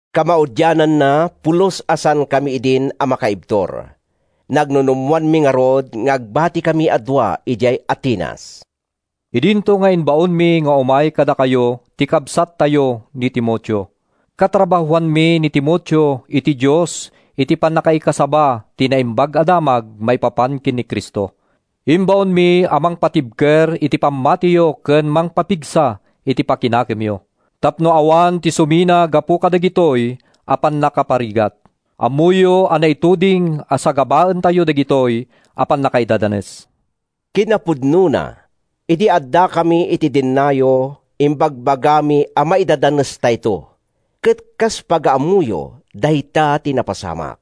Kamaudianna, pulos a saankam idin a makaibtur. Nagnunumoanmi ngarud nga agbatikami a dua idiay Atenas, idinto nga imbaonmi nga umay kadakayo ti kabsattayo ni Timoteo. Katrabahoanmi ni Timoteo iti Dios iti pannakaikasaba ti Naimbag a Damag maipapan ken ni Cristo. Imbaonmi a mangpatibker iti pammatiyo ken mangpapigsa iti pakinakemyo tapno awan ti sumina gapu kadagitoy a pannakaparigat. Ammoyo a naituding a sagabaentayo dagitoy a pannakaidadanes. Kinapudnona, idi addakami iti dennayo, imbagbagami a maidadanestayto. Ket kas pagaammoyo, dayta ti napasamak.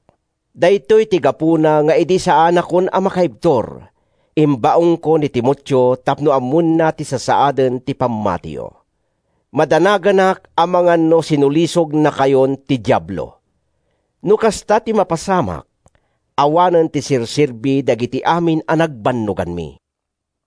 Daytoy ti gapuna nga idi saanakon a makaibtur, imbaonko ni Timoteo tapno ammoenna ti sasaaden ti pammatiyo. Madanaganak amangan no sinulisognakayon ti Diablo. No kasta ti mapasamak, awanen ti serserbi dagiti amin a nagbannoganmi.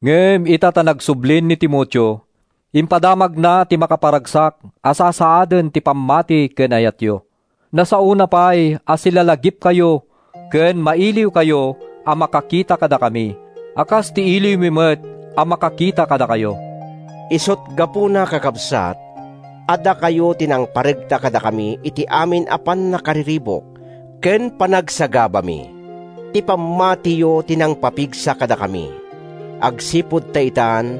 Ngem ita ta nagsublin ni Timoteo, impadamagna ti makaparagsak a sasaaden ti pammati ken ayatyo. Nasaona pay a silalagipkayo ken mailiwkayo a makakita kadakami a kas iti iliwmi met a makakita kadakayo. Isut’ gapuna, kakabsat, a dakayo ti nangparegta kadakami iti amin a pannakariribuk ken panagsagabami. Ti pammatiyo ti nangpapigsa kadakami agsipud ta itan,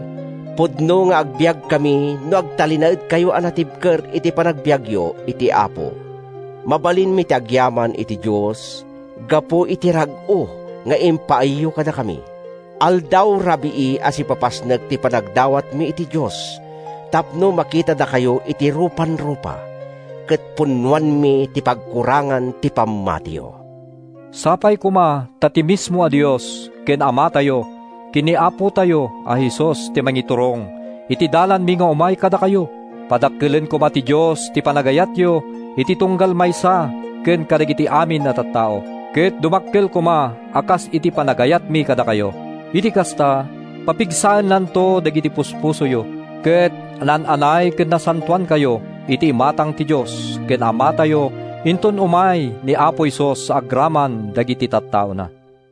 pudno nga agbiagkami no agtalinaedkayo a natibker iti panagbiagyo iti Apo. Mabalinmin ti agyaman iti Dios gapu iti rag-o nga impaayyo kadakami. Aldaw-rabii a sipapasnek ti panagdawatmi iti Dios tapno makitadakayo iti rupan-rupa, ket punnoanmi ti pagkurangan ti pammatiyo. Sapay koma ta ti mismo a Dios ken Amatayo, ken ni Apotayo a Jesus ti mangiturong iti dalanmi nga umay kadakayo! Padakkelen koma ti Dios ti panagayatyo iti tunggal maysa ken kadagiti amin a tattao, ket dumakkel koma a kas iti panagayatmi kadakayo. Iti kasta, papigsaennanto dagiti puspusoyo, ket naan-anay ken nasantoankayto iti imatang ti Dios ken Amatayo inton umay ni Apo Jesus agraman dagiti tattaona.